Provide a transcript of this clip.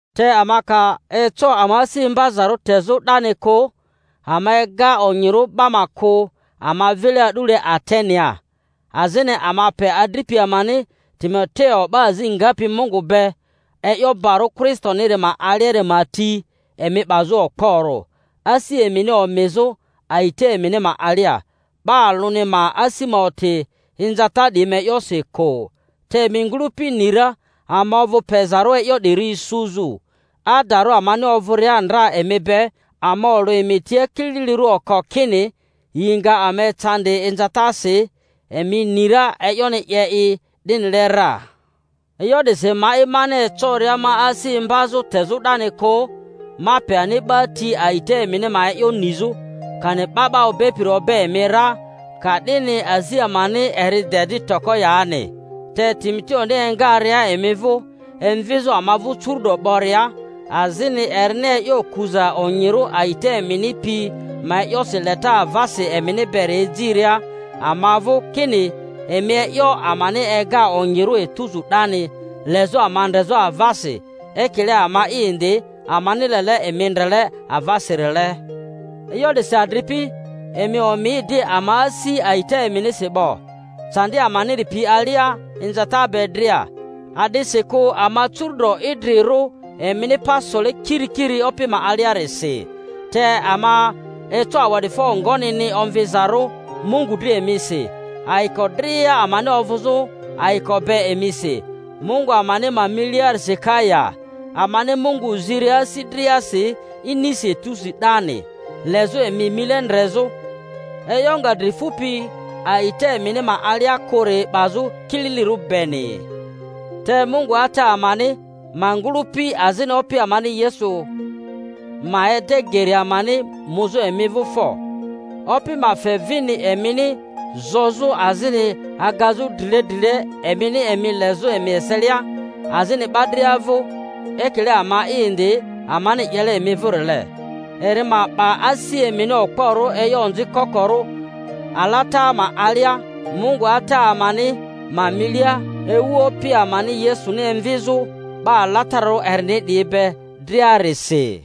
Te ama ka eco ama asi imbazarᴜ tezᴜ 'dani kᴜ, ama ega onyirᴜ 'ba ma kᴜ ama vile a'dule Atenea, azini ama pe adripi amani Timo-teo, 'ba azi ngapi Mungu be e'yo barᴜ Kristoniri ma aliari ma ti, emi 'bazᴜ okporᴜ, asi emini omizᴜ a'ita emini ma alia, 'ba alᴜni ma asi ma oti inzata 'diyi ma e'yosi kᴜ. Te emi ngᴜlᴜpi ni ra ama ovᴜ pezarᴜ e'yo 'diri isuzᴜ. Adarᴜ amani ovᴜria ndra emi be, ama olᴜ emi tia kililirᴜ oko kini yi nga ama ecandi inzatasi; emi ni ra e'yoni 'ye i 'dinile ra. E'yo 'disi ma'i mani ecoria ma asi imbazᴜ tezᴜ 'dani kᴜ, ma pe ani 'ba ti a'ita emini ma e'yo nizᴜ, kani 'ba 'ba obepiri obe emi ra, ka'dini azi amani eri de di toko yani. Te Timoteoni engaria emi vᴜ emvizᴜ ama vᴜ curu'do 'boria, azini erini e'yo kuza onyirᴜ a'ita emini pi ma e'yosi leta avasi emini beri ejiria ama vᴜ, kini emi e'yo amani ega onyirᴜ etuzu 'dani, lezᴜ ama ndrezᴜ avasi, ekile ama'i indi amani lele emi ndrele avasirile— e'yo 'disi, adripi, emi omi di ama asi a'ita eminisi 'bo, candi amaniri pi ma alia inzata be dria; a'disikᴜ ama curu’do idri-rᴜ, emini pa sole kirikiri Opi ma aliarisi. Te ama eco awa'difo ngonini omvizarᴜ Mungu dri emisi, ayiko dria amani ovᴜzᴜ ayiko be emisi Mungu amani ma miliarisi ka ya? Amani Mungu ziria asi driasi inisi etusi 'dani, lezᴜ emi mile ndrezᴜ, e'yo nga dri fupi a'ita emini ma alia kᴜri 'bazᴜ kililirᴜ beni. Te Mungu Ata amani ma ngᴜlᴜpi, azini Opi amani Yesu, ma ede geri amani muzᴜ emi vᴜ fo; Opi ma fe vini emini zozᴜ azini agazᴜ drile drile emini emi lezᴜ emi eselia, azini 'ba dria vᴜ, ekile ama'i indi amani 'yele emi vᴜrile, eri ma 'ba asi emini okporᴜ e'yo onzi kokorᴜ alata ma alia Mungu Ata amani ma milia, ewu Opi amani Yesuni emvizᴜ 'ba alatararᴜ erini 'diyi be driarisi.